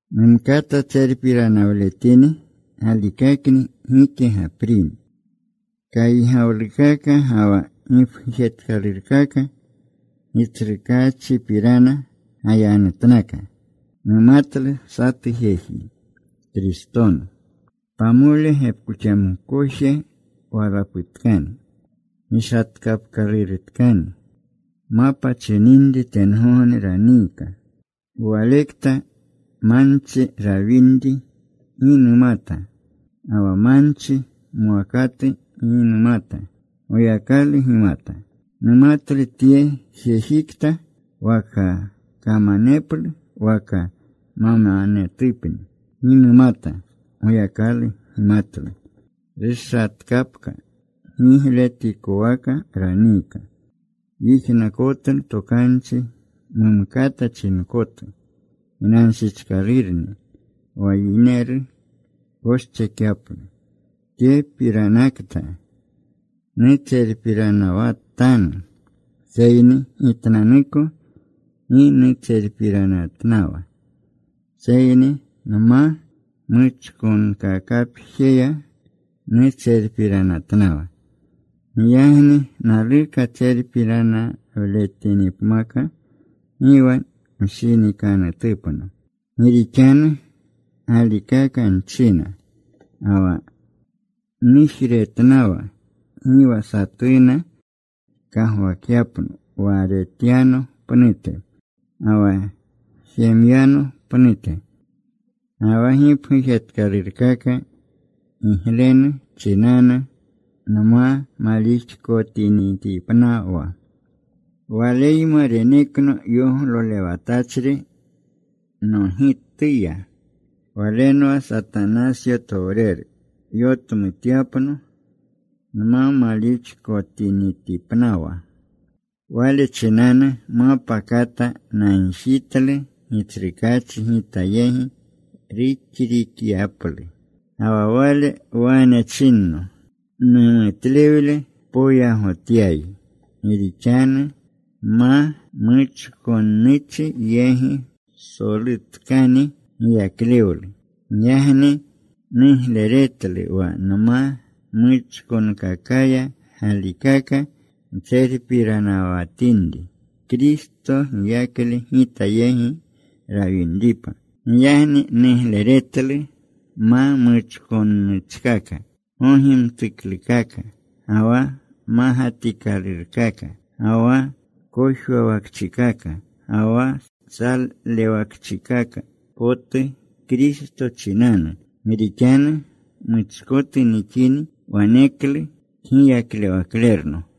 Numkata tserpiranawletini; galikakni gike gaprini. Kaygawlukaka ga wa gipgujetkalurkaka Gitsrukaachipirana gayanutnaka. Numatlu satu jeji Kristonu. Pamole gepkoxamkoje walaputkani gishatkapkalurutkani. Mapa chininri tengogne raniika walekta. Manchi rawinri gi numata ga wa manchi mwakatu gi numata. Goyakalu gimata. Numatlu tye jejikta. Waka kamaneplu waka mamanetupni gi numata. Goyakalu gimatlu. Rushatkapka. Gigletikowaka raniika. Yijnakotlu tokanchi mumkata chinkotu. Ginanshichkalurni wa yineru koschekyaplu. Tyepiranakta nutserpiranawatanu, seyni gitnanuko gi nutserpiranatnawa, seyni nma muchkonkakapjeya nutserpiranatnawa. Giyagni naluka tserpiranawletinipmaka gi wa mshinikanutupno, gi rixanu galikaka nchina. Ga wa nujretnawa gi wa satuna kagwakyapno wa retyano pnute ga wa jemyano pnute. Ga wa gipgujetkalurkaka giglenu chinanu nma malixkotinipnawa, waleyma renekno yoglolewatachri nogitya. Walenwa Satanasyotowreru yotmutyapno nma malixkotinitipnawa. Wale chinanu mapa kata nagjitlu Gitsrukaachi gita yegi ruxrikakyaplu. Ga wa Wale wane chinno, “Numutlewle poyagotyayi, gi rixanu ma muchkonnuchi yegi psolutkani giyaklewlu.” Giyagni nugleretlu wa nma muchkonkakaya galikaka ntserpiranawatinri, Kristo giyakle gita yegi rawinripa. Giyagni nugleretlu ma muchkonnuchkaka, gogimtuklukaka, ga wa magatikalurkaka, ga wa kojwawakchikaka, ga wa salewakchikaka potu Kristo chinanu. Gi rixanu muchkotu nixini, waneklu kgiyaklewaklerno.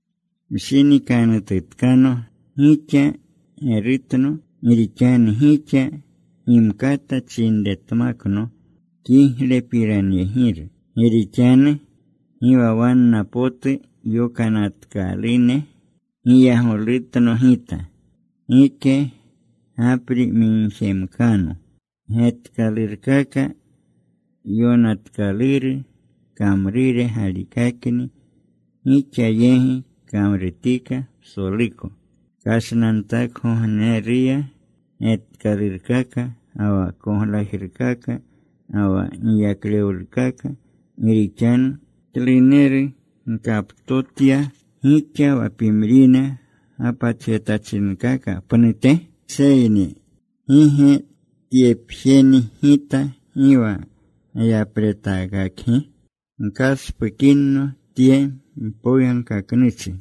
Mshinikanututkano. Gixa gerutno. Gi rixanu gixa gimkata chinretmakno kiglepiranyegiru. Gi rixanu gi wa wanna potu yokanatkalune giyagolutno gita, gike gapri migjemkano. Getkalurkaka yokanatkaluru kamrure galikakni gixa yegi kamrutika psoluko kashnantakgogneruya: getkalurkaka ga wa koglajrukaka, ga wa giyaklewlukaka. Gi rixanu ¿kluneru gkaptotya gixa wa pimrine gapatjetachinkaka pnute? Seyni ¿gi ge tyepjeni gita gi wa gayapretaakakgi? Gkaspukinno tye mpoyagkaknuchi.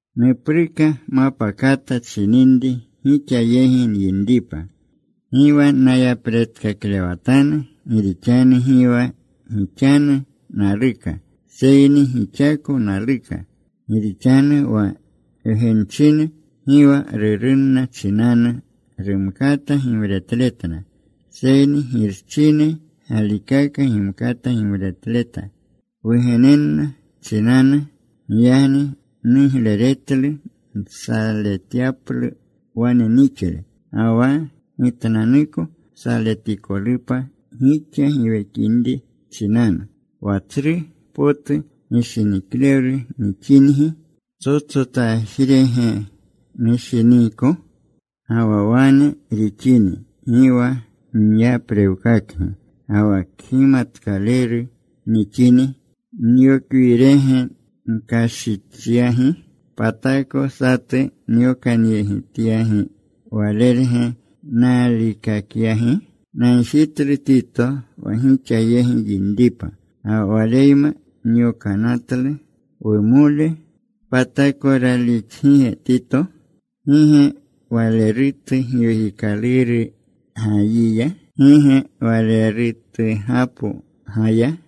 Nupruka mapa kata chininri gixa yegi nyinripa. Gi wa nayapretaakaklewatanu. Gi rixanu gi wa gixanu naluka seyni gixako naluka. Gi rixanu wa wgenchine gi wa rurunna chinanu rumkata gimretletna, seyni girchine galikaka gimkata gimretleta wugenenna chinanu. Giyagni nugleretlu nsaletyaplu wane nixle ga wa gitnanuko saletikolupa gixa giwekinri chinanu. Wa tsru potu gishiniklewlu nixingi ¿ptsotsotajrege nushiniiko? Ga wa wane rixini, gi wa nyaprewkakgi. Ga wa kgimatkaleru nixini, ¿nyokwirege nkashichyagi? ¿Patako satu nyokanyegityagi walerge naalikakyagi? Nagjitlu Tito wa gixa yegi yinripa, ga wa waleyma nyokanatlu wumole. ¿Patako raalixgige Tito? ¿Gi ge walerutu Giwekikaluru gayiya? ¿Gi ge walerutugapo gaya?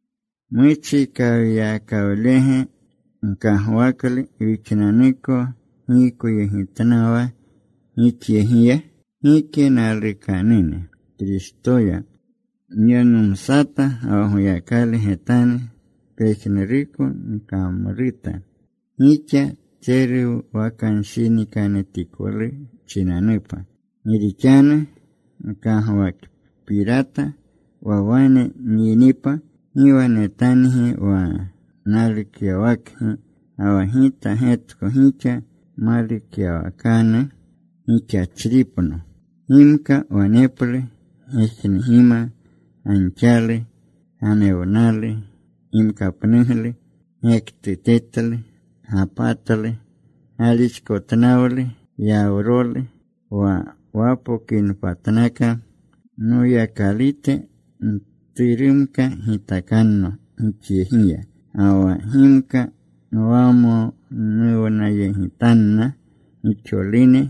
¿Muchikawyakawlege gkagwaklu wixnanuko giykoyegitnawa gixyegiya? Gike, nalukanune; Kristoya nyanumsata ga wa Goyakalu getanu. Pejnuruko nkamruta gixa tseruwakanshinikanutikolu chinanupa. Gi rixanu nkagwakpirata wa wane nyinipa gi wa netangi wa nalukyawakgi, ga wa gita getko gixa malukyawakanu gixachripno. Gimka waneplu gejnugima, ganxalu, gamewnalu, gimkapnuglu, gektutetlu, gapatlu, galixkotnawlu, yawrolu. Wa napokinpatnaka Noyakalute mturumka gitakanno gixyegiya, ga wa gimka nwamonuwnayegitanna gixolune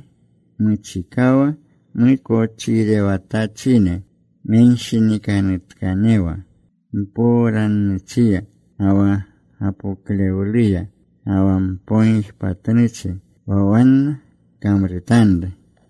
muchikawa mukochirewatachine menshinikanutkanewa mpowrannuchiya, ga wa gapoklewluya, ga wa mpogijpatnuchi wa wanna kamrutanru.